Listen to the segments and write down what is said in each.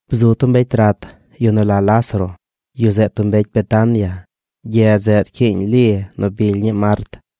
Bzu tub mbecy rat: yu nu la Lázaro. Yu zeꞌ tub mbecy Betania, gyedz zeꞌ nu rcyiiñ Li nu bily ñii Mart.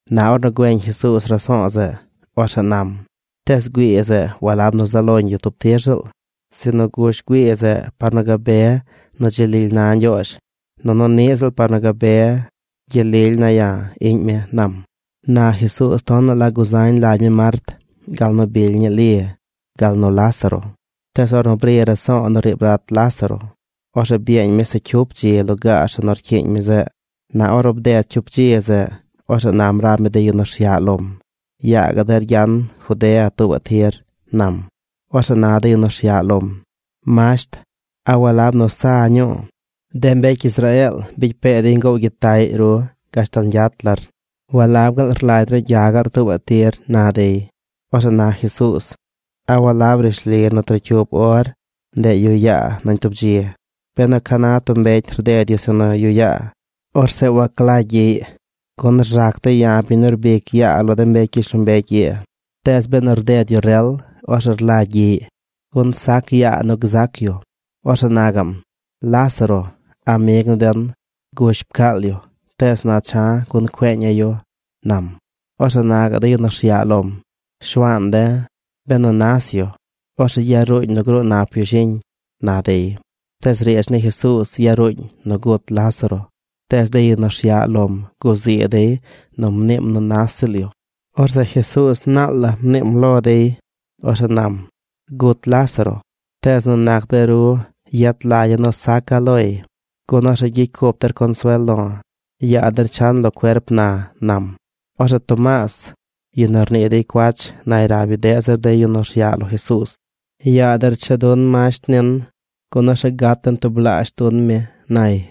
Na ornu güeñ Jesuuz raso̱o̱ zeꞌ, orzeꞌ nam: ―Tees güii zeꞌ walab nu zaꞌ loñ yu tub tir ziꞌl, sinu gush güii zeꞌ par nu gabe nu dzi lily na Ñgyoozh, nunu niꞌ ziꞌl par nu gabe gyel lily ne̱ ya̱, iꞌñ mi ―nam. Na Jesuuz tonaꞌ la guzañ lagy mi Mart, gal nu bily ñii Li, gal nu Lázaro. Tees ornu bri raso̱o̱ nu riib rat Lázaro, orzeꞌ byeeñ mi se cyup dzi lugaar zeꞌ nu rcyiiñ mi zeꞌ. Na ornu bded cyup dzi zeꞌ, orzeꞌ nam rab mi de yu nu rsyaꞌ lom: ―Yaa gaꞌ der gyan Judea tuubaꞌ tir ―nam. Orzeꞌ na de yu nu rsyaꞌ lom: ―Masht, ¿a walab nu sa ñuu, de mbecy Israeel bicy pee dey ngoow gyitaꞌy ru gashtal ñgyat lar? ¿Walab gaal rlagy ru gya gaꞌr tuubaꞌ tir? ―na dey. Orzeꞌ na Jesuuz: ―¿A walab rishli nu trocyup or ndeꞌ yuꞌ yaa nañ tub dzi? Benu ca na tub mbecy rded yu zeꞌ nu yuꞌ yaa, orzeꞌ waglagy gyiꞌy, gun rzac dey ya̱, biñ nu rbic yaa lo de mbecy gyishlombecy ii. Tees benu rded yu rel, orzeꞌ rlagy gyiꞌy, gun sac yaa nu gzac yu. Orzeꞌ na gaꞌm: ―Lázaro, amig ni den, gush pcaal yu, tees na cha̱ gun cueeña̱ yu ―nam. Orzeꞌ na gaꞌ de yu nu rsyaꞌ lom: ―Shuaan de̱, benu nas yu, ¿orzeꞌ yaruuñ nu gruu nap yu shiñ? ―na dey. Tees riidz ni Jesuuz yaruuñ nu gut Lázaro, tees de yu nu rsyaꞌ lom guzii dey nu mniim nu nas ziꞌl yu. Orzeꞌ Jesuuz naal la mniim lo dey. Orzeꞌ nam: ―Gut Lázaro. Tees nu nac de ru yet lagya̱ nu saca̱ loy, gun orzeꞌ gyicy cup der consuel lo̱. Yaa der chan lo cuerp na ―nam. Orzeꞌ Tomaas, yu nu rnii dey cuach, nay rab yu deꞌ zir de yu nu rsyaꞌ lo Jesuuz: ―Yaa der cha dun masht nin, gun orzeꞌ gat den tublaazh dun mi ―nay.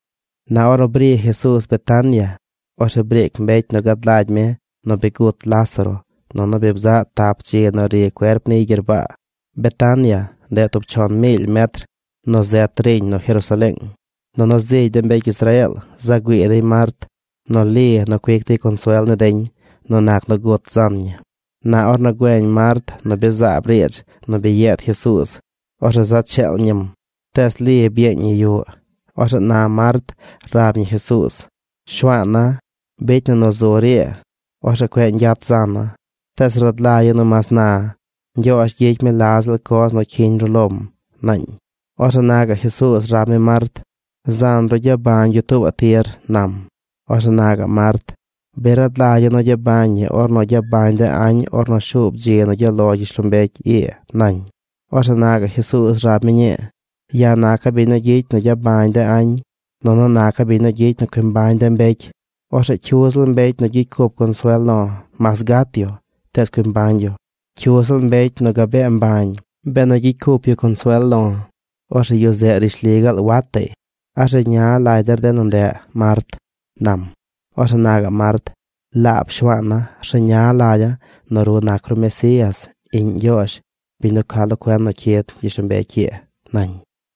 Na ornu bri Jesuuz Betania, orzeꞌ briic mbecy nu gad lagy mi nu bi gut Lázaro nunu bi bzaꞌ tap dzi nu ri cuerp niy gyerbaa. Betania, ndeꞌ tub chon miily metr nu zet riñ nu Jerusaleeng. Nunu zigy de mbecy Israeel za güii dey Mart nu Li nu cuic dey consuel ni deñ nu nac nu gut zan ñi. Na ornu güeñ Mart nu bi zaab riidz nu bi yeed Jesuuz, orzeꞌ za cheel ñim. Tees Li byeeñ ñi yuꞌ. Orzeꞌ na Mart rab ñi Jesuuz: ―Shuaana̱, bicy na nu zur ii, orzeꞌ cueꞌ ñgyat zana̱. Tees rad lagya̱ nu mas na, Ñgyoozh gyicy mi la ziꞌl coz nu cyiñ ru lom ―naañ. Orzeꞌ na gaꞌ Jesuuz rab mi Mart: ―Zan ru gyabañ yu tuubaꞌ tir ―nam. Orzeꞌ na gaꞌ Mart: ―Bi rad lagya̱ nu gyabañ ñi ornu gyabañ de añ ornu shuub dzi nu gyaꞌ lo gyishlombecy ii ―nañ. Orzeꞌ na gaꞌ Jesuuz rab mi ñii: ―Ya̱ naca̱ biñ nu gyicy nu gyabañ de añ, nunu naca̱ biñ nu gyicy nu cui mbañ de mbecy. Orzeꞌ cyu ziꞌl mbecy nu gyicy cup consuel lo̱, mas gat yu, tees cui mbañ yu. Cyu ziꞌl mbecy nu gabee mbañ, benu gyicy cup yu consuel lo̱, orzeꞌ yu zeꞌ rishli gaal wataꞌy. ¿A rzeña lagy der de nu ndeꞌ Mart? ―nam. Orzeꞌ na gaꞌ Mart: ―Laab Shuaana̱, rzeña lagya̱ nu ru nac ru Mesías, iꞌñ Ñgyoozh, biñ nu ca lo cuen nu cyid gyishlombecy ii ―nañ.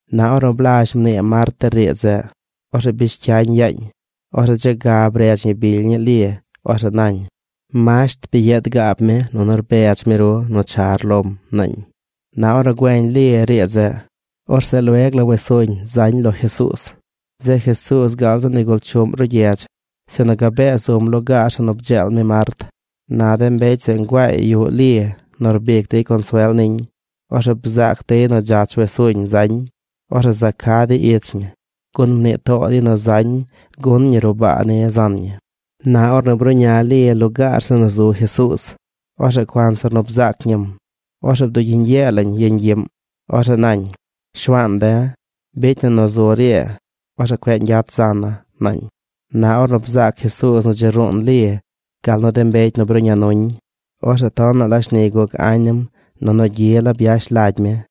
Na ornu blazh mnii Mart de riidz zeꞌ, orzeꞌ bish cyañ yaañ. Orzeꞌ dze ga bredz ñi bily ñii Li. Orzeꞌ nañ: ―Masht bi yeed gaab mi nunu rbedz mi ru nu char lom ―naañ. Na ornu güeñ Li riidz zeꞌ, orzeꞌ lueg la wes suñ zañ lo Jesuuz. Zeꞌ Jesuuz gaal zi nigul chuꞌm ruꞌ gyedz, sinu gabee zum lugaar zeꞌ nu bdzeel mi Mart. Na de mbecy zeꞌ nguaay yuꞌ Li nu rbic dey consuel niñ. Ornu bzaac dey nu dzach wes suñ zañ, orzeꞌ za ca dey ich ñi, gun mnii too dey nu zañ nu gun ñi ruꞌ baa ni zan ñi. Na ornu bruꞌña Li lugaar zeꞌ nu zu Jesuuz, orzeꞌ cuanzir nu bzaac ñim, orzeꞌ bdugyiñ yee lañ yeñ gyiꞌm. Orzeꞌ nañ: ―Shuaan de̱, bicy na nu zur ii, orzeꞌ cueꞌ ñgyat zana̱ ―nañ. Na ornu bzaac Jesuuz nu dzi ruun Li gal nu de mbecy nu bruꞌña nuñ, orzeꞌ tonaꞌ la shni guc añ nim nunu gyi la byash lagy mi.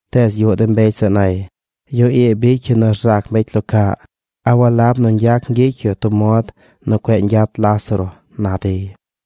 Tees yuꞌ de mbecy zeꞌ nay: ―Yu ii bicy yu nu rzac mbecy lo caꞌ. ¿A walab nu ñgyac ñgyicy yu tub mod nu cueꞌ ñgyat Lázaro? ―na dey.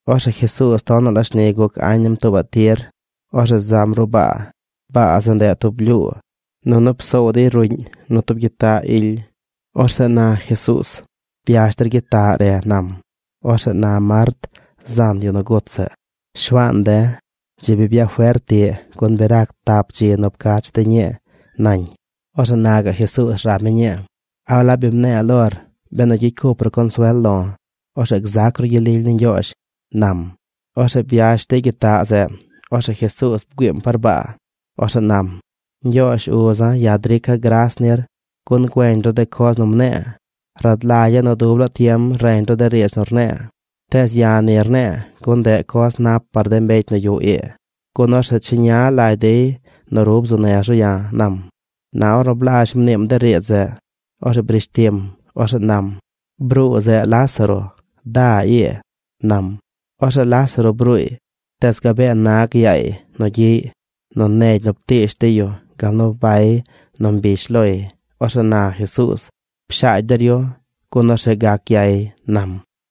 Orzeꞌ Jesuuz tonaꞌ la shni guc añ nim tuubaꞌ tir. Orzeꞌ zam ruꞌ baa. Baa zeꞌ, ndeꞌ tub blyuu. Nunu psoow dey ruꞌñ nu tub gyitaꞌ ily. Orzeꞌ na Jesuuz: ―Byash der gyitaꞌ re ―nam. Orzeꞌ na Mart, zan yu nu gut zeꞌ: ―Shuaan de̱, dzi bi byafert tiꞌ gun bi rac tap dzi nu pcach de̱ ñii ―nañ. Orzeꞌ na gaꞌ Jesuuz rab mi ñii: ―¿A walab bi mne̱e̱ lor, benu gyicy cup ru consuel lo̱, orzeꞌ gzac ru gyel lily ni Ñgyoozh? ―nam. Orzeꞌ byash dey gyitaꞌ zeꞌ. Orzeꞌ Jesuuz bgüiim par baa. Orzeꞌ nam: ―Ñgyoozh uza̱, ya̱ drica̱ gras nir gun güeñ ru de coz nu mne̱e̱. Rad lagya̱ nu dub laa tiem reñ ru de riidz nu rne̱e̱, tees ya̱ ni rne̱e̱ gun ndeꞌ coz nap par de mbecy nu yuꞌ ii, gun orzeꞌ cheña lagy dey nu ru bzuu nez ru ya̱ ―nam. Na ornu blazh mniim de riidz zeꞌ, orzeꞌ brish tim. Orzeꞌ nam: ―¡Bruu zeꞌ Lázaro! Da ii ―nam. Orzeꞌ Lázaro bruuy, tees gabee nag yaay nu gyiꞌy nu negy nu ptiish dey yu gal nu bay nu mbish loy. Orzeꞌ na Jesuuz: ―Pshaagy der yu, gun orzeꞌ gac gyay ―nam.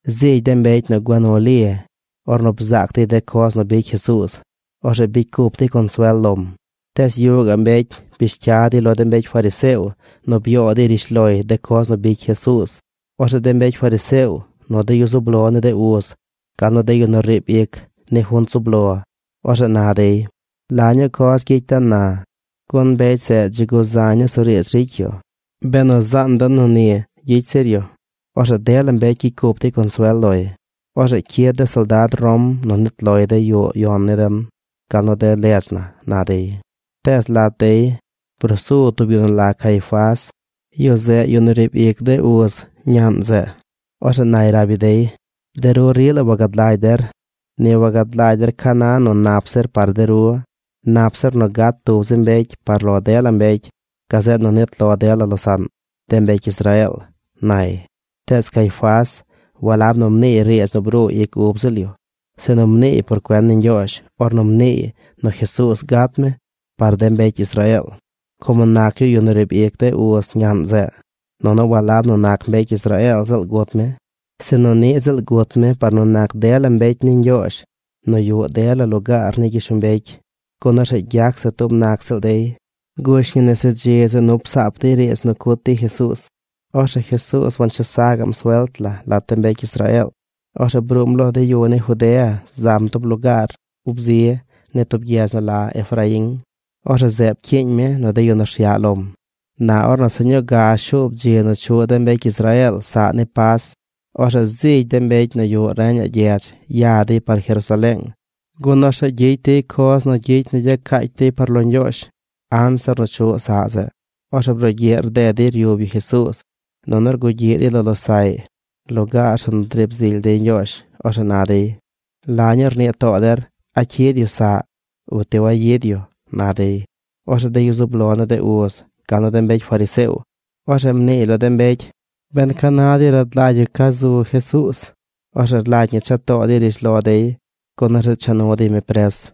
Zigy de mbecy nu gua nu Li, ornu bzaac dey de coz nu bicy Jesuuz, orzeꞌ bicy cup dey consuel lom. Tees yuꞌ gaꞌ mbecy bish cya dey lo de mbecy fariseo nu byoo dey rishloy de coz nu bicy Jesuuz. Orzeꞌ de mbecy fariseo, nu de yu zub lo ni de uz, gal nu de yu nu riib ic ni junt zub lo, orzeꞌ na dey: ―¿La ñuu coz gyicy den na? Gun mbecy zeꞌ dzi guzañ nusuriidz ricy yu. Benu zaan den nu ni gyicy zir yu, orzeꞌ dela mbecy gyicy cup dey consuel loy. Orzeꞌ cyid de soldad Rom nu nit lo dey yuꞌ yon ni den gal nu de ledz na ―na dey. Tees lat dey brusu tub yu nu la Caifás. Yu zeꞌ yu nu riib ic de uz ñaꞌn zeꞌ. Orzeꞌ nay rab yu dey: ―De ru rila wagad lagy der. Ni wagad lagy der ca na nu nap zir par de ru. Nap zir nu gat tub zi mbecy par lo dela mbecy gazeꞌ nu nit lo dela losaꞌn: de mbecy Israeel ―nay. Tees Caifás walab nu mniiy riidz nu bruu ic ub ziꞌl yu, sinu mniiy por cuen ni Ñgyoozh ornu mniiy nu Jesuuz gat mi par de mbecy Israeel, como nac yu yu nu riib ic de uz ñaꞌn zeꞌ. Nunu walab nu nac mbecy Israeel ziꞌl gut mi, sinu niꞌ ziꞌl gut mi par nu nac dela mbecy ni Ñgyoozh nu yuꞌ dela lugaar ni gyishlombecy, gun orzeꞌ gyac se tub nac ziꞌl dey. Gush ñi nese dzi zeꞌ nu psaap dey riidz nu cut dey Jesuuz. Orzeꞌ Jesuuz wanchesa gaꞌm suelt la lat de mbecy Israeel. Orzeꞌ bruum lo de yu ni Judea zam tub lugaar ub zi ni tub gyedz nu la Efraín. Orzeꞌ zeꞌ pcyiiñ mi nu de yu nu rsyaꞌ lom. Na ornu se ñuu ga shuub dzi nu chuꞌ de mbecy Israeel saꞌ ni Pas, orzeꞌ zigy de mbecy nu yuꞌ reñaꞌ gyedz ya dey par Jerusaleeng, gun orzeꞌ gyicy dey coz nu gyicy nu gyacaacy dey par lo Ñgyoozh anzir nu chuꞌ saꞌ zeꞌ. Orzeꞌ brugyiꞌ rded dey ryub yu Jesuuz, nunu rgugyiꞌ dey lo losaꞌy lugaar zeꞌ nu driib zily dey Ñgyoozh. Orzeꞌ na dey: ―¿La ñuu rnii too der? ¿A cyid yu saꞌ o ti wayid yu? ―na dey. Orzeꞌ de yu zub lo ni de uz, gal nu de mbecy fariseo, orzeꞌ mnii dey lo de mbecy ben ca na dey rad lagy yu ca zu Jesuuz. Orzeꞌ rlagy ñi cha too dey rishlo dey gun orzeꞌ cha nu dey mi pres.